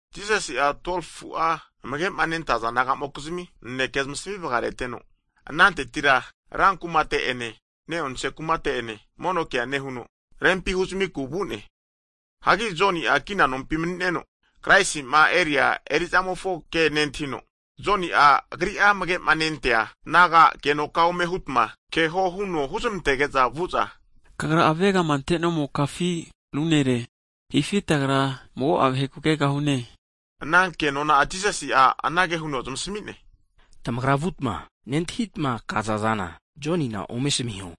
Jisasi'a 12fu'a amage'ma nentaza disaipol nagamokizmi naneke zamasmi vagareteno, anantetira rankumate'ene ne'onse kumate ene mono ke nehuno, rempi huzamiku vu'ne. Hagi Joni'a kina nompi mani'neno, Kraisi'ma eria erizamofo ke nentahino, Joni'a agri'a amagema nentaza disaipol naga agenoka ome hutma keho huno huzamantege'za, vu'za, Kagra avegama ante'nomokafi ru nere, hifi tagra mago'a vaheku kegahune? Ana ke nona'a Jisasi'a anage huno zamasmi'ne. Tamagra vutma, nentahita, kaza zana Jonina ome asamiho,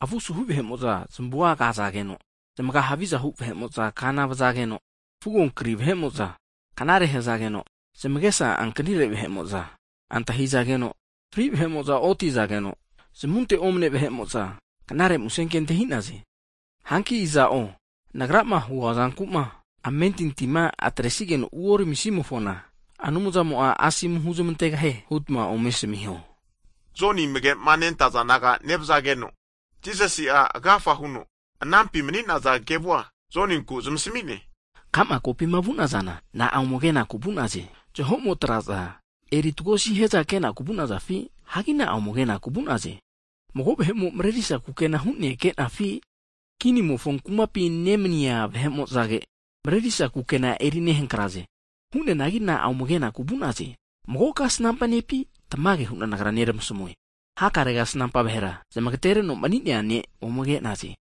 avu suhu vahe'mo'za kazageno, zmaga havizahu vahe'mo'za kana vazageno, fugo namuzmare'nea vahe'mo'za knare hazageno, zamagesa ankanire vahe'mo'za antahi'zageno, fri vahe'mo'za otizageno, zamunte omane vahe'mo'za knare muse ke antahi'naze. Hanki iza'o Nagrama huazanku'ma amentintima ataresigeno uoramisimofona, Anumzamo'a asomu huntegahie hutma ome asamiho. Joni amagema nentaza disaipol naga nevazageno, Jisasi'a agafa huno anampi mani'naza kevua Joninkura zamasmi'ne, Ka'ma kopima vu'nazana na'a ome ke'naku vu'naze? Zahomo traza eri tagosi hiaza ke'naku vu'nazafi? Hagi na'a ome kenaku vu'naze? Mago vahe'mo marerisa kukena hu'nea kenafi? Kinimofo kumapi nemaniza vahe'mo'zage marerisa kukena eri nehankraze. Hu'neanagi na'a ome kenaku vu'naze? Mago kasnampa nepi? Tamage hu'na Nagra neramasamue, hakare kasnampa vahera zamagatereno mani'nea ne' ome ke'naze.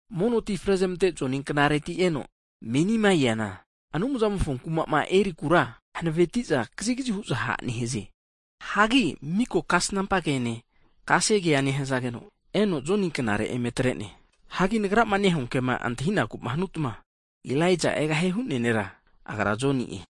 Mono ti frezamante Joni knareti eno menima eana, Anumzamofo kumama erikura hanavetiza kazigazi hu'za ha' nehaze. Hagi miko kasnampa kene, kasegea nehazageno eno Joni knare eme atre'ne. Hagi Nagrama nehua kema antahinakuma hanutma, antahiho, Elaijae egahie hu'nea nera agra'a Joni'e.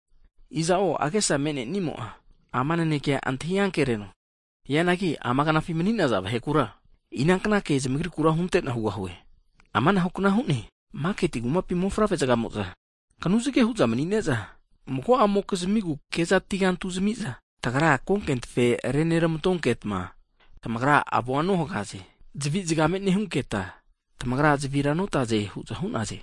Iza'o agesama me'nenimo'a, ama nanekea antahi ankereno. Hianagi amagnafi mani'naza vahe kura inankna ke zamagrikura hunte'na hugahue? Amanahu kna hu'ne, maketi kumapi mofavre'zagamo'za kanuzage hu'za mani'ne'za, mago'amokizmigu ke'za atigantu zami'za, tagra konke tafe reneramantonketa, tamagra avoa nohagaze, zavi nehunketa, tamagra zavira notaze hu'za hu'naze.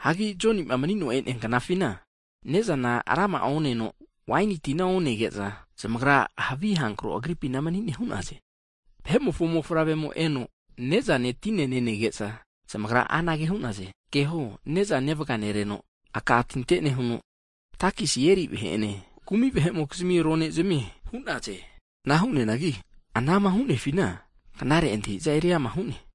Hagi Joni'ma manino e'nea knafina, ne'zana rama'a oneno, waini tina onege'za, zamagra havi avamu agripina mani'ne hu'naze! Vahe'mofo mofavremo eno ne'zane tine nenege'za, zamagra anage hu'naze, keho ne'za nevaganereno, aka tinte nehuno, takesi eri vahe'ene kumi vahe'mokizmi ronezamie hu'naze! Ana hu'neanagi anama hu'nefina knare antahi'za, eriama hu'ne.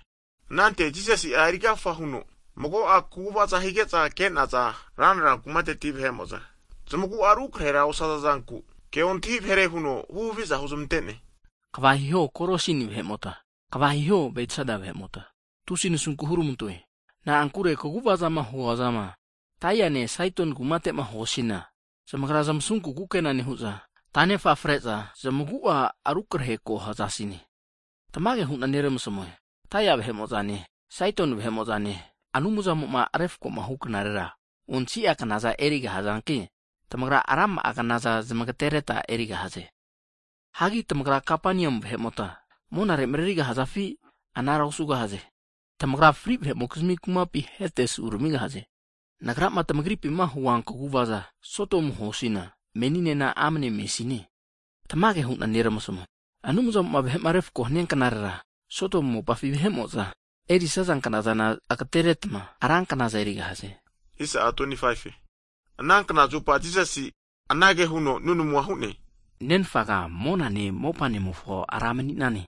Anante Jisasi erigafa huno mago'a kaguvaza higeza ke'naza ranra kumateti vahe'mo'za zamagu'a rukarehe osaza zanku, ke ontahi vahere huno huhaviza huzamantene. Kva hiho Korasini vahe'mota! Kva hiho Bedsaita vahemota tusi nasunku huramantoe! Na'ankure kaguvazama huazama Tairine, Saidoni kumatema huasina, zamagra zamasunku kukena nehu'za, tanefa fare'za zamagu'a rukarehe ko hazasine. Tamage hu'na neramasamue, Tairi vahe'mo'zane, Saidoni vahe'mo'za Anumzamoma vahe'ma refakoma huknare osi'a knaza erigahazanki, tamagra rama'a knaza zamagareta erigahaze. Hagi tamagra Kapaniumu vahe'mota monarera marerigahafi? Anara osugahaze. Tamagra fri vahe'mofo kumapi Hedes uramigahaze, Nagrama tamagripima hua kaguvaza Sodomu huasina, meninena amane mesine. Tamage hu'na neramasmue, vahe'ma refakohu knarera, Sodomu mopafi vahe'mo'za erisaza knazana, agateretma ra knaza erigahaze. Ana knazupa Jisasi anage huno nunamuna hu'ne, Nenfaga monane, mopamofo Ra mani'nane,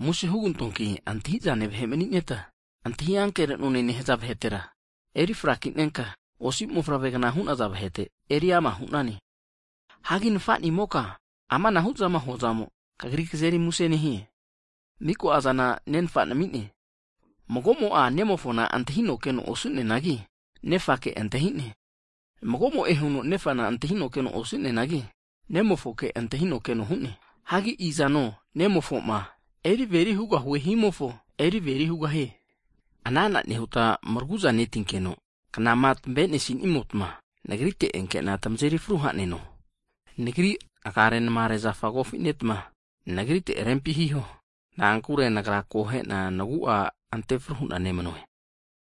susu hu'na musenke hugantoe. Antahi'zane vahe manita, antahi ankerenone nehaza vahetera, eri frakinenka, osi mofavre'gna hu'naza vahete eri ama hu'nane. Hagi Nafa'nimoka amanahu'zama hua zamo'a, Kagri kazeri muse nehie. Miko'azana Nenfa nami'ne, magomo'a Nemofona antahino keno osu'neanagi, Nefake antahi'ne. Mago'mo'e huno Nefana antahino keno osu'neanagi, Nemofoke antahino keno hu'ne. Hagi Nemofoma eri averi hugahue himofo, eri averi hugahie. Ana'ana nehuta maragu'za neti'nageno, knama tamavenesinimota nagrite enkena tamazeri fru ha'neno. Nagri agarenamare zafa eri kofinetma, Nagriteti rempi hiho. Na'ankure Nagra akohena nagu'a antefru hu'na nemanue.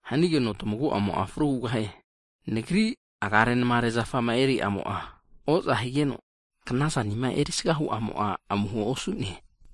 Hanigeno tamagu'amo'a fru hugahie. Nagri agarenmare zafama eri'amo'a oza higeno, knazanima erisaga hu'amo'a, amuho osu'ne.